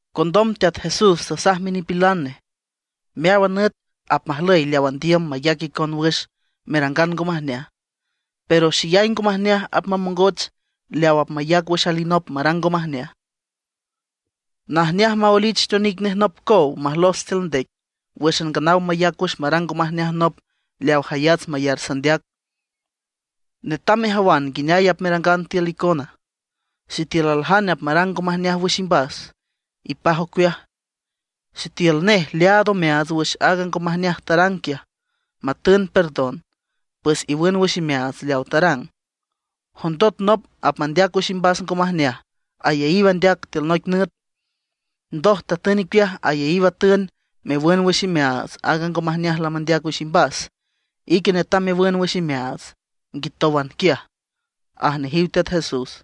Condom Teat Jesús tasaj minipilan nej: ―Meáwan nüt apmajlüy leaw andiüm mayac icon wüx merangan ngo majneaj. Pero, ¡xeyay ngo majneaj apmamongoch leaw apmayac wüx alinop marang ngo majneaj! Najneaj maoelich teonic nej nop cow majlos tiül ndec, wǘxan nganaw mayac wüx marang ngo majneaj nop leaw jayats mayar sandeac. Netam mejawan nguineay apmerangan tiül icona. ’Sitiül aljane apmarang ngo majneaj wüx imbas, ipaj ocueaj. Sitiül nej leaad omeaats wüx aaga ngo majneaj tarang quiaj, matün perdon, pues iwün wüx imeaats leawa tarang. Jondot nop apmandeac wüx imbas ngo majneaj ayaíw andeac tiül noic nüt, ndoj tatün icueaj ayaíw atün mewün wüx imeaats aaga ngo majneaj lamandeac wüx imbas, ique netam mewün wüx imeaats nguitówan quiaj ―aj nejiw Teat Jesús.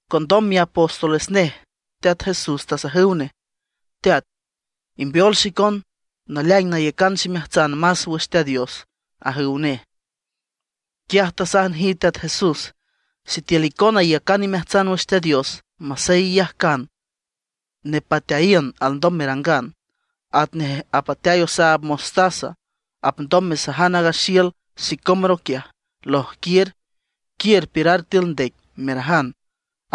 Condom miapóstoles nej Teat Jesús tasajüw nej: ―Teat, imbeol xicon naleaing nayacan ximeajtsan más wüx Teat Dios ―ajüw nej. Quiaj tasaj nejiw Teat Jesús: ―Sitiül icona iyacan imeajtsan wüx Teat Dios masey iyajcan nepateayiün alndom merangan, atnej apateay osaab mostaza, apndom mesajan aaga xiül sicómoro quiaj: “Lojquiür, quiür piürar tiül ndec”, merajan,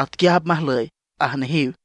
atquiaj apmajlüy ―aj nejiw.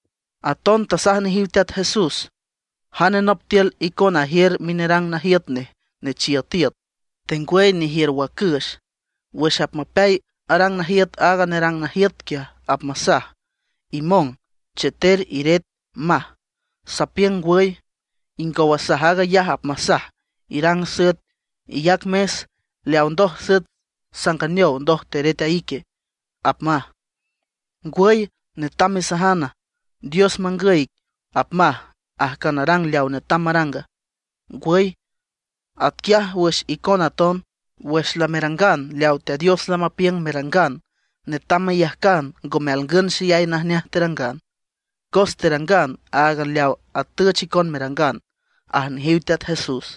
Aton tasaj nejiw Teat Jesús: ―Jane nop tiül icona ajiür minerang najiüt nej nechiüt iüt, tengwüy nejiür wacüx, wüx apmapeay arang najiüt aaga nerang najiüt quiaj, apmasaj: “Imong, cheter, iret”, maj. Sapiüng ngwüy, ingow asaj aag ayaj apmasaj: “Irang süet, iyac mes. Leaw ndoj süet sanganeow ndoj teret a ique”, apmaj. Ngwüy ¿netam masaja: “Dios mangüy ic”, apmaj, ajcan arang leaw netam maranga? ¡Ngwüy! Atquiaj wüx icona aton, wüx lamerangan leawa Teat Dios lamapiüng merangan, netam meyajcan ngome alngün xeyay najneaj terangan, cos terangan áagan leaw atüch icon merangan ―aj nejiw Teat Jesús.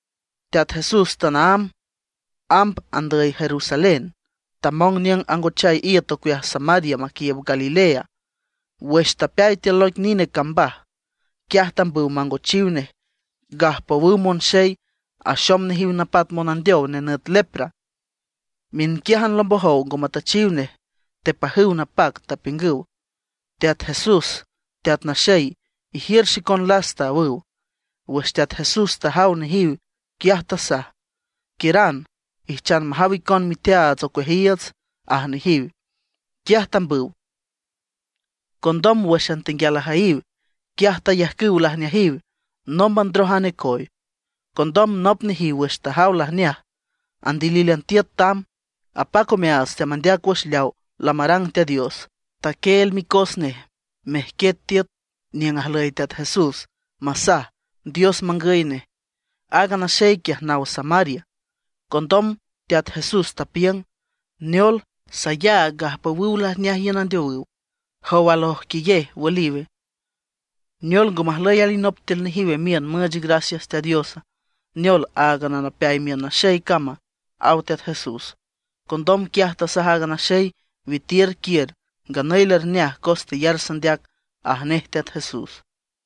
Teat Jesús tanaámb amb andüy Jerusalén, tamong niüng angochay iüt ocueaj Samaria maquiiüb Galilea. Wüx tapeay tiül noic nine cambaj, quiaj tambüw mangochiw nej gajpowüw monxey axom nejiw napat monandeow nenüt lepra. Miünquiájan lombojow ngo matüchiw nej. Tepajüw napac, tapiüngüw: ―¡Teat Jesús, Teat Naxey! ¡Ijiür xicon lasta! ―awüw. Wüx Teat Jesús tajaw nejiw, quiaj tasaj: ―Quiüran, ijchan majaw icon miteaats ocueajiiüts ―aj nejiw. Quiaj tambüw, condom wǘxan tenguial ajüyiw, quiaj tayajcüw lajneajiw, nómban ndroj a necoy. Condom nop nejiw wüx tajaw lajneaj, andilílan tiüt tamb, apac omeaats, teamandeac wüx leawa lamarang Teat Dios. Taquieel micos nej mejquiet tiüt niüng ajlüy Teat Jesús masaj Dios mangüy nej. Aaga naxey quiaj naw Samaria. Condom Teat Jesús tapiüng: ―Neol, sayaag gajpowüw lajneaj iün andeowüw. ¿Jow al ojquiyej, wüliwe? ¿Neol ngo majlüy alinop tiül nejiw miün müüch gracias Teat Diosa; neol áagan a napeay miün naxey cama? ―aw Teat Jesús. Condom quiaj tasaj aaga naxey: ―Witiür quiür, nganüy lerneaj cos teyar sandeac ―aj nej Teat Jesús.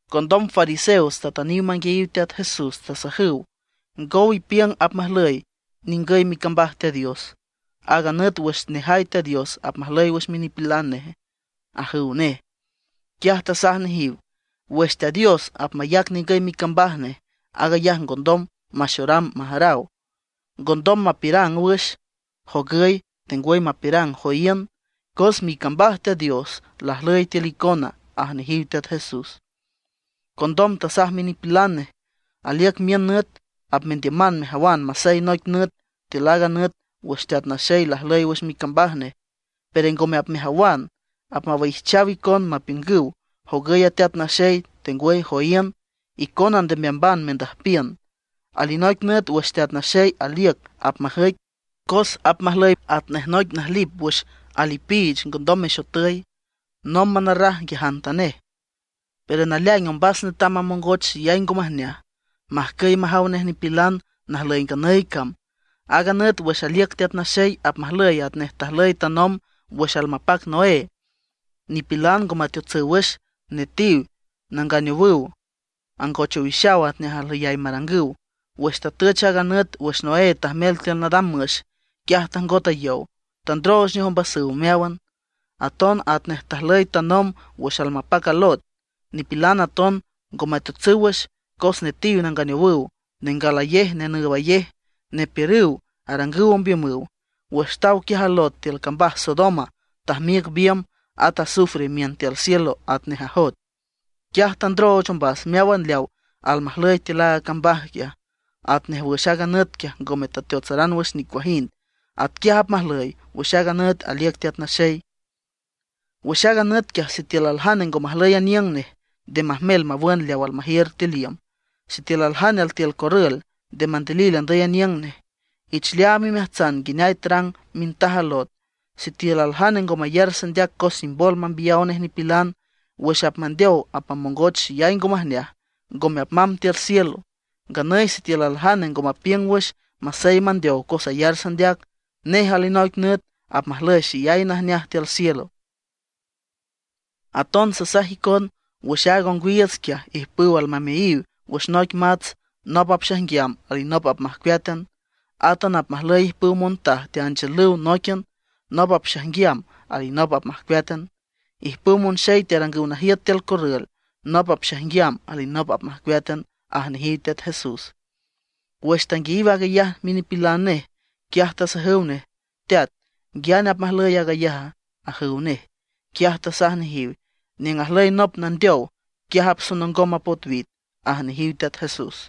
Condom fariseos tatüniw manguiayiw Teat Jesús, tasajüw: ―¿Ngow ipiüng apmajlüy ningüy micambaj Teat Dios, aaga nüt wüx nejay Teat Dios apmajlüy wüx minipilan neje? ―ajüw nej. Quiaj tasaj nejiw: ―Wüx Teat Dios apmayac ningüy micambaj nej, aag ayaj ngondom maxoram majaraw. Ngondom mapiürang wüx: “Jogüy”, tengwüy mapiürang: “Joíün”, cos micambaj Teat Dios lajlüy tiül icona ―aj nejiw Teat Jesús. Condom tasaj minipilan nej: ―Aliüc miün nüt apmendiüman mejawan masey noic nüt tiül aaga nüt wüx Teat Naxey lajlüy wüx micambaj nej; pero ngome apmejawan. Apmawaijchaw icon mapiüngüw: “Jogüy a Teat Naxey”, tengwüy: “Joíün.” Icona nde meamban mendüjpiün. Alinoic nüt wüx Teat Naxey aliüc apmajüic, cos apmajlüy atnej noic najlip wüx ajlipiich ngondom mexotüy, nómban arraj nguiajantanej. Pero naleaing ombas netam mamongoch xeyay ngo majneaj, majcüy majaw nej nipilan najlüy nganüy cam. Aaga nüt wüx aliüc Teat Naxey apmajlüy atnej tajlüy tanomb wüx almapac Noé. Nipilan ngo meteotsüw wüx; netiw nanganeowüw, angoch owixaw atnej ajlüyay marangüw. Wüx tatüch aaga nüt wüx Noé tajmel tiül nadam müx; quiaj tajngot a yow, tandrooch nej ombasüw meáwan. Aton atnej tajlüy tanomb wüx almapac a Lot, nipilan aton ngo meteotsüw wüx; cos netiw, nanganeowüw, nengalayej, nenüübayej, nepiürüw, arangüw ombiümüw. Wüx taw quiaj a Lot tiül cambaj Sodoma tajmiüc biümb, at azufre imiün tiül cielo atnej ajoet. Quiaj tandrooch ombas meáwan leaw almajlüy tiül aaga cambaj quiaj. Atnej wüx aaga nüt quiaj ngome teateotsaran wüx nicuajind, atquiaj apmajlüy wüx a nüt aliüc Teat Naxey. ’Wüx aaga nüt quiaj sitiül aljane ngo majlüy aniüng nej, nde majmel mawün leaw almajiür tiül iüm. Sitiül aljane altiül corrül, nde mandilil andüy aniüng nej. Ich leaam imeajtsan nguineay tarang mintaj a Lot. Sitiül aljane ngo mayar sandeac cos imbol mambiyaw nej nipilan, wüx apmandeow apmamongoch xeyay ngo majneaj, ngome apmamb tiül cielo. Nganüy sitiül aljane ngo mapiüng wüx masey mandeow cos ayar sandeac, nej alinoic nüt apmajlüy xeyay najneaj tiül cielo. ’Aton sasaj icon, wüx aaga ongwiiüts quiaj ijpüw almameayiw wüx noic mats, nop apxaijnguiam, alinop apmajcueátan. Átan apmajlüy ijpüw montaj teanchiülüw nóiquian, nop apxaijnguiam, alinop apmajcueátan. Ijpüw monxey tearangüw najiüt tiül corrül, nop apxaijnguiam, alinop apmajcueátan ―aj nejiw Teat Jesús. Wüx tanguiayiw aag ayaj minipilan nej, quiaj tasajüw nej: ―Teat ¿nguiane apmajlüy aag ayaja? ―ajüw nej. Quiaj tasaj nejiw: ―Niüng ajlüy nop nandeow, quiaj apsonongom a potwit ―aj nejiw Teat Jesús.